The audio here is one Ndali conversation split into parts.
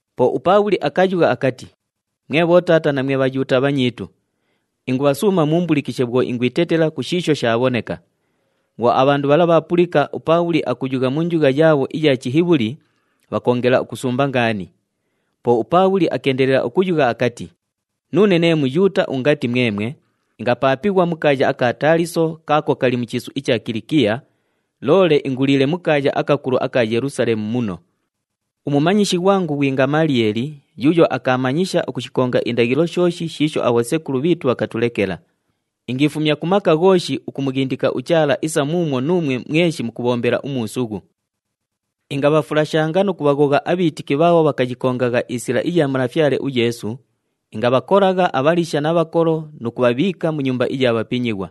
Po uPaabhuli akayugha akati, “Mwe bhotaata na mwe Bhayuuta abhanyiitu, ingubhasuuma muumbulikishe bhwo ingwitetela ku shiisho shaabhoneka.” Bhwo abhandu bhala bhaapulika uPaabhuli akuyugha mu njugha yaabho iya Chihibhuli, bhakoongela ukusumba ngaani. Po uPaabhuli akeendelela ukuyugha akati, “Nuune nee Muyuuta ungati mwemwe, ingapaapighwa mu kaaya aka Taaliso kaako kali mu chiisu icha Kilikiya, loole inguliile mu kaaya akakulu aka Yelusaleemu muno. Umumanyishi ghwangu ghwi Ngamaliyeeli yuuyo akaamanyisha ukushikonga indaghilo shooshi shiisho abhosekulu bhiitu bhakatulekela. Ingiifumya ku maka ghooshi ukumughindika uChaala isa muumwo nuumwe mweshi mukubhombela umuusughu. “Ingabhafulashanga nu kubhaghogha abhiitiki bhaabho bhakayikongagha iSila iya Malafyale uYeesu, ingabhakolagha abhaliisha na bhakolo nu kubhabhiika mu nyumba iya bhapinyighwa.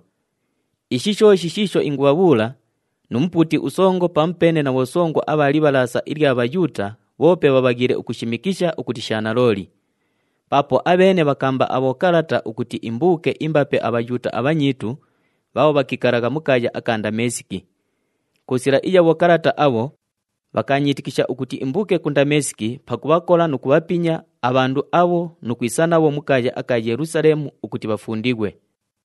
Ishi shooshi shiisho ingubhabhuula, nu mupuuti usongo pamupeene na bhosongo abha Libhalaasa ilya Bhayuuta bhoope bhabhaghiile ukushimikisha ukuti sha nalooli. Paapo abheene bhakaamba abhokalata ukuti imbuuke imbape aBhayuuta abhanyiitu bhaabho bhakiikalagha mu kaaya aka Ndameesiki. Ku sila iya bhokalata abho, bhakaanyiitikisha ukuti imbuuke ku Ndameesiki pakubhakola nu kubhapinya abhandu abho nu kwisa nabho mu kaaya aka Yelusaleemu ukuti bhafundighwe.”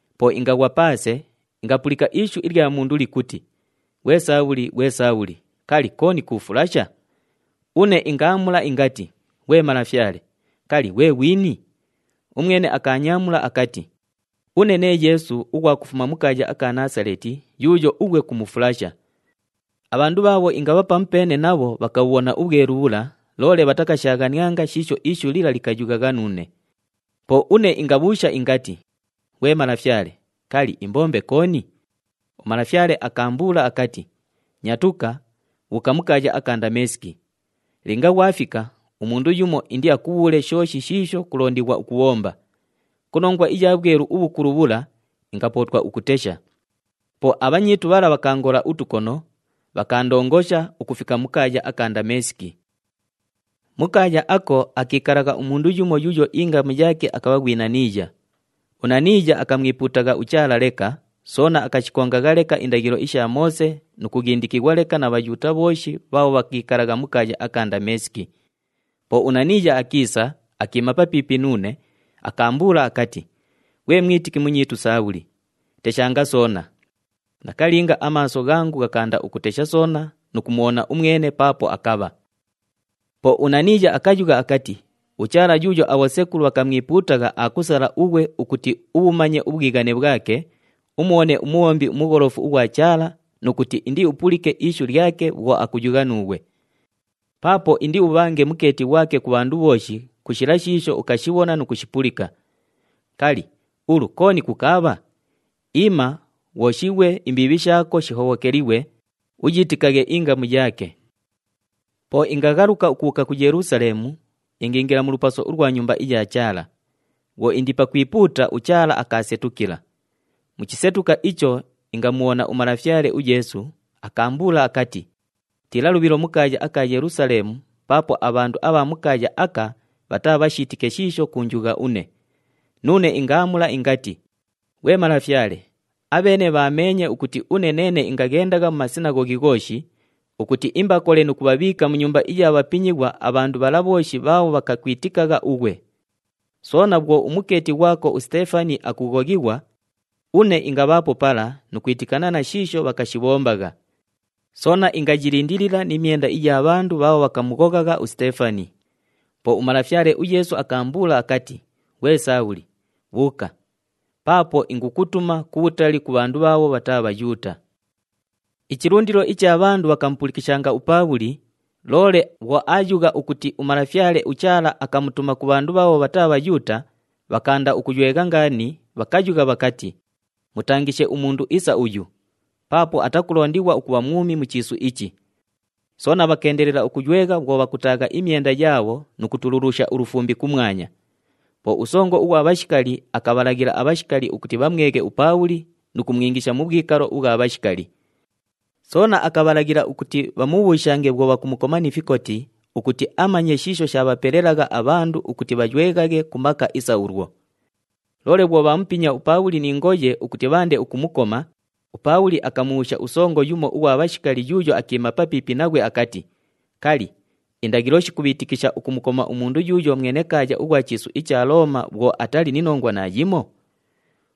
Po ingaghwa paase, ingapulika ishu ilya mundu likuti, ‘Ghwe Saabhuli! Ghwe Saabhuli! Kali, kooni kuufulasha?’ Une ingaamula ingati, ‘Ghwe Malafyale, kali, ghwe ghwini?’ Umwene akaanyaamula akati, ‘Une nee Yeesu ughwa kufuma mu kaaya aka Naasaleeti yuuyo ughwe kumufulasha.’ Abhandu bhaabho ingabha pamupeene nabho bhakabhubhona ubhwelu bhula, loole bhatakashaaghanianga shiisho ishu lila likayughagha nuune. Po une ingabhuusha ingati, ‘Ghwe malafyale, kali, imbombe kooni?’ UMalafyale akaambuula akati, ‘Nyatuka! Bhuuka mu kaaya aka Ndameesiki. Linga ghwafika, umundu yumo indiakubhuule shooshi shiisho kulondighwa ukubhomba.’ Ku nongwa iya bhwelu ubhukulu bhula, ingapootwa ukutesha. Po abhanyiitu bhala bhakaangola utukono, bhakaandongosha ukufika mu kaaya aka Ndameesiki. “Mu kaaya ako, akiikalagha umundu yumo yuuyo ingamu yaake akabha ghwi Naniiya. UNaniiya akamwipuutagha uChaala leka, soona akashikongagha leka indaghilo isha Moose nu kughindikighwa leka na Bhayuuta bhooshi bhaabho bhakiikalagha mu kaaya aka Ndameesiki. Po uNaniiya akiisa, akiima papiipi nuune, akaambuula akati, ‘Ghwe mwitiki munyiitu Saabhuli, teshanga soona.’ Nakalinga, amaaso ghangu ghakaanda ukutesha soona nu kumubhona umwene paapo akabha. “Po uNaniiya akayugha akati, ‘UChaala yuuyo abhosekulu bhakamwipuutagha aakusala ughwe ukuti ubhumanye ubhwighane bhwake, umubhone uMubhombi uMugholofu ughwa Chaala nu kuti indiupulike ishu lyake bhwo akuyugha nuughwe. Paapo indiubhange mukeeti ghwake ku bhandu bhooshi ku shila shiisho ukashibhona nu kushipulika. Kali, ulu kooni kukaabha? Iima! Ghwoshighwe, imbiibhi shaako shihobhokelighwe, uyiitikaghe ingamu yaake.’ “Po ingaghaluka ukubhuuka ku Yelusaleemu, ingiingila mu lupaso ulwa Nyumba iya Chaala. Bhwo indi pakwipuuta, uChaala akaasetukila. Mu chisetuka icho, ingamubhona uMalafyale uYeesu, akaambuula akati, ‘Tiila lubhilo mu kaaya aka Yelusaleemu paapo abhandu abha mu kaaya aka bhataabhashiitike shiisho kuunjugha une.’ Nuune ingaamula ingati, ‘Ghwe Malafyale, abheene bhameenye ukuti une neene ingaghendagha mu masinaghoghi ghooshi, ukuti imbakole nu kubhabhiika mu nyumba iya bhapinyighwa abhandu bhala bhooshi bhaabho bhakakwitikagha ughwe! Soona bhwo umukeeti ghwako uSiteefani akughoghighwa, une ingabhaapo pala nu kwitikana na shiisho bhakashibhombagha. Soona ingayilindilila ni myenda iya bhandu bhaabho bhakamughoghagha uSiteefani.’ Po uMalafyale uYeesu akaambuula akati, ‘Ghwe Saabhuli, bhuuka! Paapo ingukutuma kubhutali ku bhandu bhaabho bhataa Bhayuuta.’” Ichilundilo icha bhandu bhakamupulikishanga uPaabhuli, loole bhwo aayugha ukuti uMalafyale uChaala akamutuma ku bhandu bhaabho bhataa Bhayuuta, bhakaanda ukuywegha ngaani, bhakayugha bhakati, “Mutangishe umundu isa uyu! Paapo atakulondighwa ukubha mwumi mu chiisu ichi!” Soona bhakeendelela ukuywegha bhwo bhakutaagha imyenda yaabho nu kutululusha ulufumbi kumwanya. Po usongo ughwa bhashikali akabhalaghila abhashikali ukuti bhamweghe uPaabhuli nu kumwingisha mu bhwikalo ubhwa bhashikali. Soona akabhalaghila ukuti bhamubhuushange bhwo bhakumukoma ni fikoti ukuti amanye shiisho shaabhapelelagha abhandu ukuti bhayweghaghe ku maka isa ulwo. Loole bhwo bhaamupinya uPaabhuli ni ngoye ukuti bhaande ukumukoma, uPaabhuli akamubhuusha usongo yumo ughwa bhashikali yuuyo akiima papiipi naghwe akati, “Kali, indaghilo shikubhiitikisha ukumukoma umundu yuuyo mwenekaaya ughwa mu chiisu icha Looma bhwo atali ni nongwa naayimo?”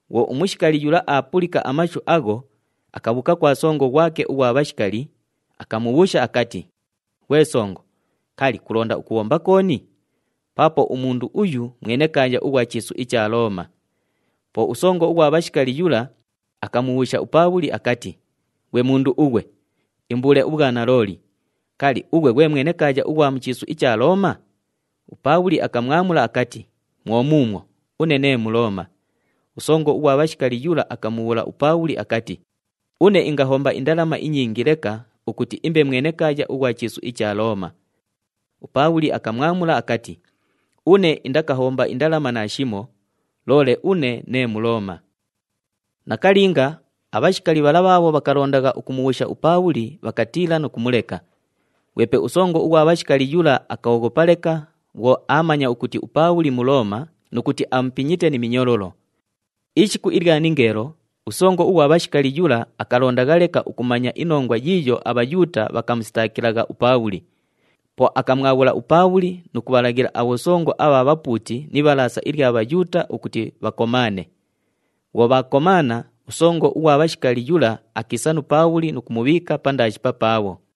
Bhwo umushikali yula aapulika amashu agho, akabhuuka kwa songo ghwake ughwa bhashikali, akamubhuusha akati, “Ghwe songo, kali, kulonda ukubhomba kooni? Paapo umundu uyu mwenekaaya ughwa mu chiisu icha Looma!” Po usongo ughwa bhashikali yula akamubhuusha uPaabhuli akati, “Ghwe mundu ughwe, imbuule ubhwanalooli, kali, ughwe ghwe mwenekaaya ughwa mu chiisu icha Looma?” UPaabhuli akamwamula akati, “Mwo muumwo, une nee Mulooma.” Usongo ughwa bhashikali yula akamubhuula uPaabhuli akati, “Une ingahomba indalama inyingi leka ukuti imbe mwenekaaya ughwa chiisu icha Looma.” UPaabhuli akamwamula akati, “Une indakahomba indalama naashimo, loole une nee Mulooma.” Nakalinga, abhashikali bhala bhaabho bhakalondagha ukumubhuusha uPaabhuli bhakatiila nu kumuleka. Ghwepe usongo ughwa bhashikali yula akooghopa leka bhwo aamanya ukuti uPaabhuli Mulooma nu kuti amupinyite ni minyololo. Ishiku ilya ningeelo, usongo ughwa bhashikali yula akalondagha leka ukumanya inongwa yiiyo aBhayuuta bhakamusitaakilagha uPaabhuli. Po akamwabhula uPaabhuli nu kubhalaghila abhosongo abha bhapuuti ni Ibhalaasa ilya Bhayuuta ukuti bhakomaane. Bhwo bhaakomaana, usongo ughwa bhashikali yula akiisa nu Paabhuli nu kumubhiika pandaashi papaabho.